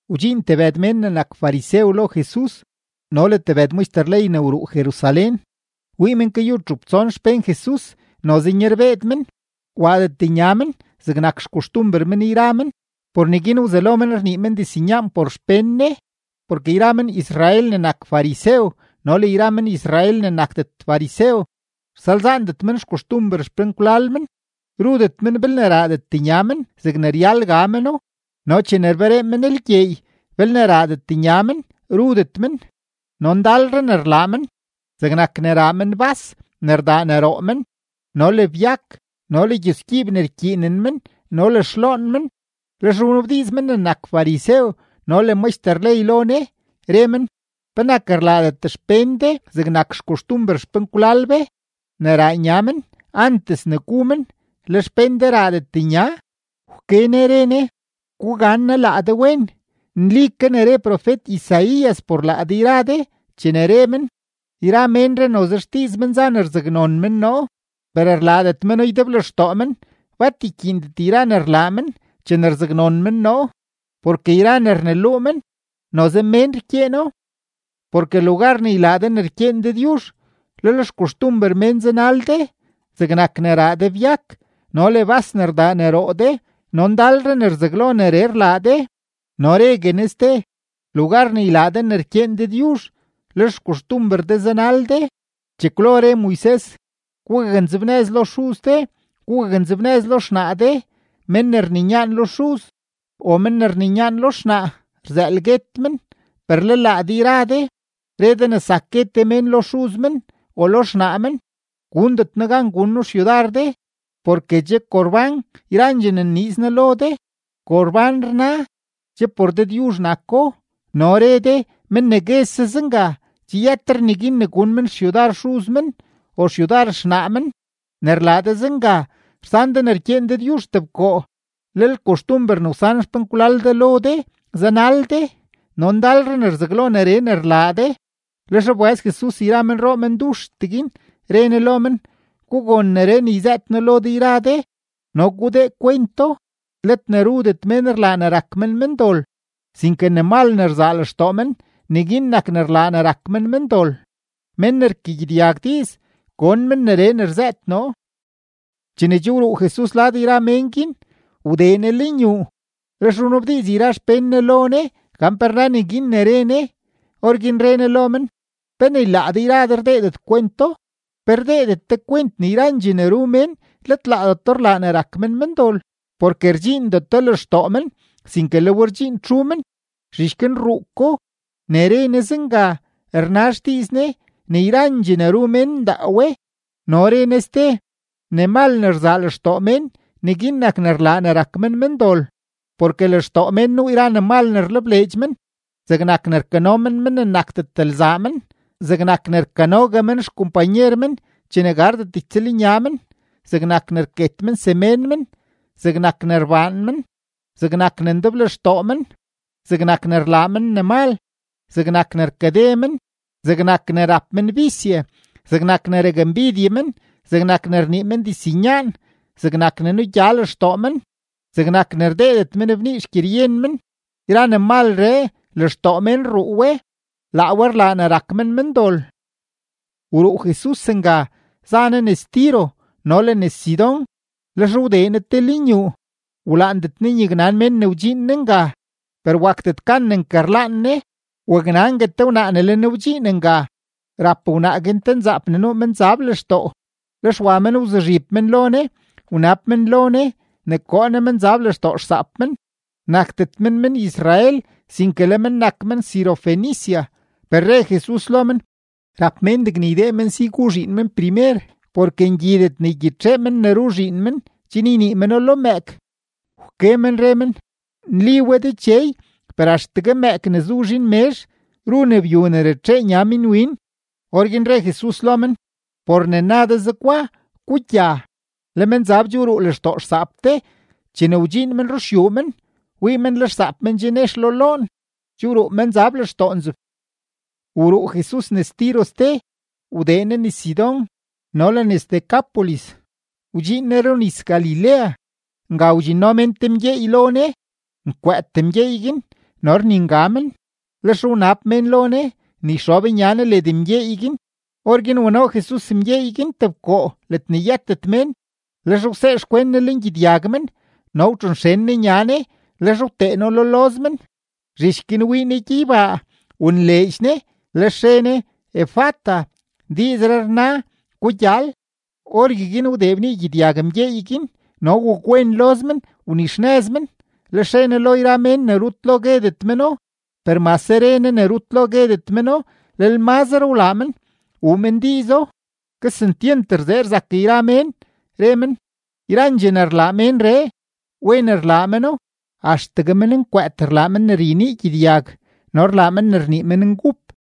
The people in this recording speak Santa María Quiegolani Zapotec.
Wdxiin tebëd men ne nak farisew lo Jesus no le tebëd maxter ley ne wruu Jerusalén. Wii men kayu txup tson xpén Jesus noze nyarbeed men, waadet nya men zegne nak xkoxtumber men yra men, por neguin wzelo men rnii men diznyaan por xpén Ne. (Porke yra men-Israel ne nak farisew no le yra men-Israel ne nakdet farisew, rsalzaandet men xkoxtumber xpenkwlal men, rudet men belne raadet nya men zegne ryal ga meno. No chene rberee men lgyeey, belne raadet nya men, rudet men. No ndalre ne rlaa men, zegnak ne raa men bas ne rdaa ne roo men no le byak no le gyusgyiib ne rkyiinen men no le xloon men.) Lex wnabdiiz men ne nak farisew no le maxter ley lo Ne, re men: ―¿Penak rlaadet xpén de zegnak xkoxtumber xpenkwlal be ne raa nya men antes ne gu men, le xpén de raadet nya? Wke Ne re Ne: ―Gugannaa laa de wen. Nli ke ne re profet-Isaías por laa de yra de chene re men: Yra ménree noze xdiiz men za ne rzaknon men noo, per rlaadet meno ydeblextoo men. Bat rkyiindet yra ne rlaa men chene rzaknon men noo, porke yra ne rneluu men, noze mén rkyeeno. Porke lugar ne ylaa de ne rkyeen Dëdyuzh, lel xkoxtumber mén zanal de: zegnak ne raa de byak no le bas ne rdaa ne roo de, no ndalre ne rzaglo neree rlaa de. No regue Ne ste: ―Lugar ne ylaa de ne rkyeen Dëdyuzh, lel xkoxtumber de zanal de. Chekwlo re Moises: “Gugaknzebnëz lo xuz de, gugaknzebnëz lo xnaa de”, “Mén ne rninyaan lo xuz o men ne rninyaan lo xnaa, rzëël guet men.” Per le laa de yra de re de ne zak gue te mén lo xuz men o lo xnaa men: “Gundet noo gan gun noo xyudar de porke che Corbán yrandxee ne nniiz noo lo de” (Corbán rna, che por Dëdyuzh nako). No re de, men ne guese zenga, che yëtre neguin ne gun men xyudar xuz men o xyudar xnaa men. Ne rlaa de zenga, rsan de ne rkyeen Dëdyuzh tebkoo, lel koxtumber ne wsan xpenkwlal de lo de zanal de. No ndalre ne rzaglo neree rlaa de. Lex wbëz Jesus yra menroo menduxtee guin, re Ne lo men: ―Gugon neree ne yzëët noo lo de yra de no gudee kwento: Let ne rudet mén rlaa ne rak men mendol, sinke ne mal ne rzaa lextoo men, neguin nak ne rlaa ne rak men mendol. Men ne rkagyedyag diiz, gon men neree ne rzëët noo. Chene che wruu Jesus lad yra mén guin, wdee Ne lenyuu, lex wnabdiiz yra xpén Ne lo Ne gan pe rna neguin ne re Ne. Orguin re Ne lo men: ―¿Pe ni laa de yra de rdeedet kwento? ¿Pe rdeedet de kwent ne yrandxee ne ru mén, let laadeto rlaa ne rak men mendol? Porke rdxiindeto lextoo men, sinke le we rdxiin txu men, zhich guin rruu ko. Ne re Ne zenga, rna xdiiz Ne ne yrandxee ne ru mén ndaa we. No re Ne ste: ―Ne mal ne rzaa lextoo mén, neguin nak ne rlaa ne rak men mendol. Porke lextoo mén nuu yra ne mal ne rlebleedx men, zegnak ne rkano men mén ne nakdet lzaa men, zegnak ne rkanogue men xkompanyer men chene gardet ytsëlnya men, zegnak ne rket men semén men, zegnak ne rbaan men, zegnak ne ndeblextoo men, zegnak ne rlaa men ne mal, zegnak ne rkade men, zegnak ne rap men bisye, zegnak ne rakmbidye men, zegnak ne rnii men diznyaan, zegnak ne nugya lextoo men, zegnak ne rdeedet men bnii xgyeryen men. Yra ne malree, lextoo mén rruu we. Laa we nak ne rlaa ne rak men mendol. Wruu Jesus nga, za Ne nes Tiro no le nes Sidón. Lex wdee Ne te lenyuu; wlaandet Ne ne nyaknan mén ne wdxiin Ne nga, per wakdet gan ne nkarlaan Ne. Waknangue te wnaa ne le Ne wdxiin nga. Rap wnaa guin te nzaap ne nuu menzab lextoo, lex wa men wzuzhib men lo Ne, wnab men lo Ne ne koo Ne menzab lextoo xsaap men. Nakdet men men-Israel, sinke le men nak men-Sirofenicia. Per re Jesus lo men: ―Rap mén degne ydee men si gu zhiin men primer, porke ngyidet ne ygyitxee men ne ru zhiin men chen ynii meno lo mëëk. Wke men re men: ―Nli we Dechey; per axtegue mëëk ne zu zhiin mezh ru ne byu ne ratxee nya minwin. Orguin re Jesus lo men: ―Por ne na de zegwa, gugya. Le menzab che wruu lextoo xsaap de. Chene wdxiin men ruxyuu men, wii men le xsaap men che nex lo loon; che wruu menzab lextoo nzeb. Wruu Jesus nes Tiro ste, wdee Ne nes Sidón no le nes Decápolis, wdxiin Ne runis-Galilea. Nga wdxinno mén te mgyeey lo Ne, nkwëët mgyeey guin no rninga men; lex wnab mén lo Ne ne yxob nya Ne led mgyeey guin. Orguin wano Jesus mgyeey guin tebkoo ledne yëtet mén. Lex wsee xkwen Ne lengyedyag men no wtxonxen Ne nya Ne, lex wtee No lo loz men. Zhich guin wii Ne gyeybaa, wonleedx Ne, lex re Ne: ―¡Efata! ―diizree rna: ¡Gugyal! Orgueguin wdee bnii gyedyag mgyeey guin, no wakwen loz men, wnixnëz men. Lex re Ne lo yra mén ne rut lo guedet meno; per mase re Ne ne rut lo guedet meno, lel mazre wlaa men wuu men diizo. Kesentyent rzee rzak yra mén, re men: ―Yrandxee ne rlaa ménree, wen rlaa meno; axtegue mennkwëët rlaa men ne ryenii gyedyag no rlaa men ne rnii menngup.